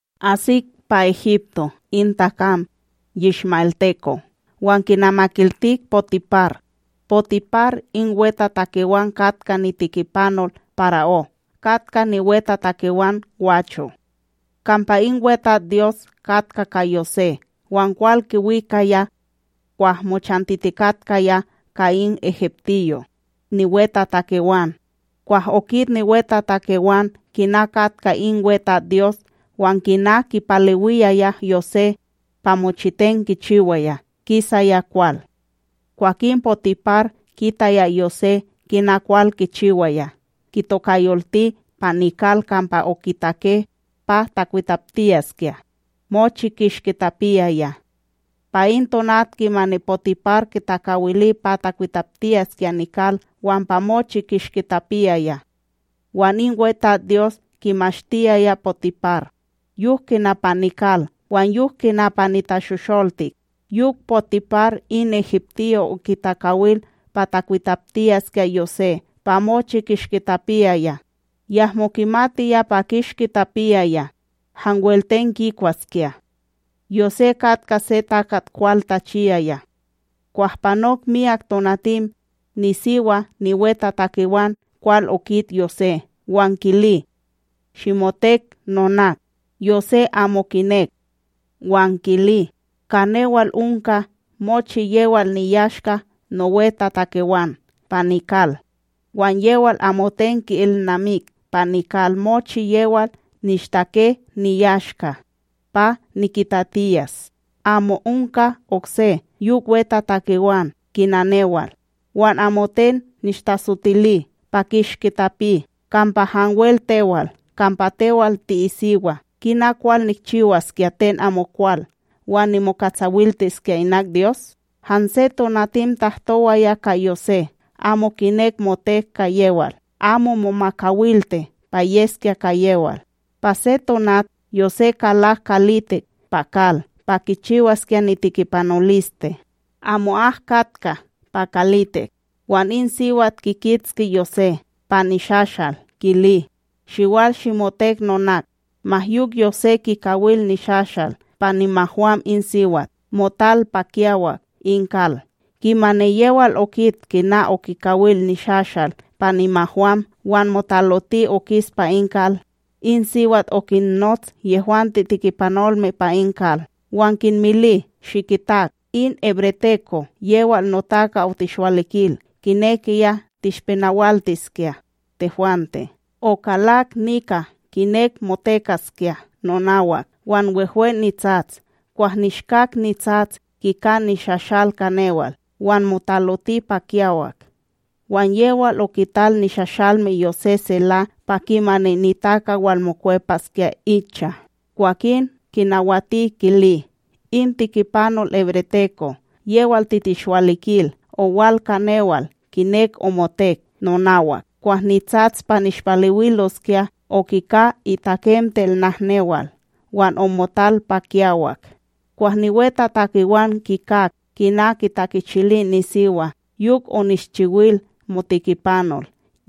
Asik pa Egipto in takam, yishma'elteko' wan kinamakiltik Potipar, Potipar in wetatakewan katka nitikipanol para'ó katka niwetatakewan gwacho'. Kampa in WeTatsDyos katka ka Yosé wan kwal kiwikaya. Kwah mochantitikatkaya ka in egiptiyo niwetatakewan, kwah okit niwetatakewan kina katka in WeTatsDyos wan kina kipalewiyaya Yosé pa mochiten kichiwaya kisaya kwal. Kwakin Potipar kitaya Yosé kina kwal kichiwaya, kitokayolti pa nikal kampa okitake pa takwitaptiyaskya mochi kishki tapiyaya. Pa in tonat kimani Potipar kitakawili pa kikwitaptiyaskya nikal wan pa mochi kishki tapiyaya. Wan in WeTatsDyos kimashtiyaya Potipar, yok kina pa nikal wan yok kina pa nitashosholtik. Yok Potipar in egiptiyo okitakawil pa takwitaptiyaskya Yosé pa mochi kishki tapiyaya, yahmo kimatiya pa kishki tapiyaya hanwel ten kikwaskya. Yosé katka se takat kwal tachiyaya. Kwah panok myak tonatim, nisiwa niwetatakewan kwal okit Yosé wan kili: ―Shimotek nonak. Yosé amo kinek wan kili: ―Ka newal onka mochi yewal niyashka nowetatakewan pa nikal, wan yewal amoten ki'ilnamik pa nikal mochi yewal nishtake niyashka pa nikitatiyas. Amo onka okse yok wetatakewan kina newal. Wan amoten nishtatsotili pa kishki tapi, kampa hanwel tewal, kampa tewal ti'isiwa. Kina kwal nikchiwaskya ten amokwal wan nimokatsawiliskya inak Dyos? Hanse tonatim tahtowaya ka Yosé amo kinek motek ka yewal, amo momakawilti pa yeskya ka yewal. Pa se tonat, Yosé kalak kalitik pa kal pa kichiwaskya nitikipanoliste, amo'ak katka pa kalitik. Wan in siwat kikitski Yosé pa nishashal kili: “Shiwal shimotek nonak!” Ma yok Yosé, kikawil nishashal pa nimahwam in siwat, motal pa kiyawak in kal. Kimani yewal okit kina okikawil nishashal pa nimahwam wan motaloti okis pa in kal, in siwat okinnots yehwante tikipanolme pa in kal wan kinmili: “Shikitak!, in hebreteko yewal notaka otishwalikil kinekiya tishpenawaltiskya tehwante. Okalak nika kinek motekaskya nonawak, wan wehwe nitsats. Kwah nishkak nitsats, kika nishashal ka newal wan motaloti pa kiyawak.” Wan yewal okital nishashalme Yosé sela pa kimani nitaka walmokwepaskya icha. Kwakin kinawati kili: “In tikipanol hebreteko yewal titishwalikil owal ka newal kinek omotek nonawak. Kwah nitsats pa nishpalewiloskya, okika itakemtel nahnewal wan omotal pa kiyawak.” Kwah niwetatakewan kikak kina kitakichili nisiwa, yok onishchiwil motikipanol,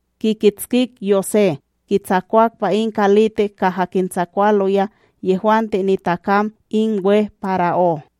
kikitskik Yosé kitsakwak pa in kalitik kaha kintsakwaloya yehwante nitakam in we para'ó.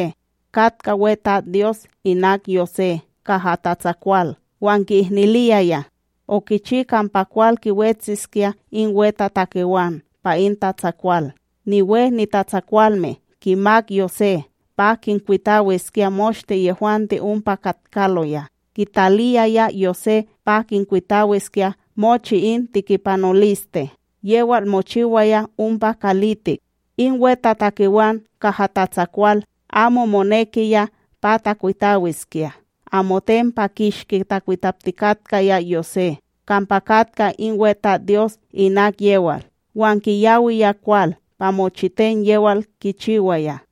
katka WeTatsDyos inak Yosé kaha tatsakwal wan ki'ihniliyaya. Okichi kampa kwal kiwetsiskya in wetatakewan pa in tatsakwal, niwe nitatsakwalme kimak Yosé pa kinkwitawiskya moshte yehwante ompa katkaloya, kitaliyaya Yosé pa kinkwitawiskya mochi in tikipanoliste yewal mochiwaya ompa kalitik. In wetatakewan kaha tatsakwal amo monekiya pa takwitawiskya, amoten pa kishki takwitaptikatkaya Yosé kampa katka in WeTatsDyos inak yewal, wan kiyawiya kwal pa mochiten yewal kichiwaya.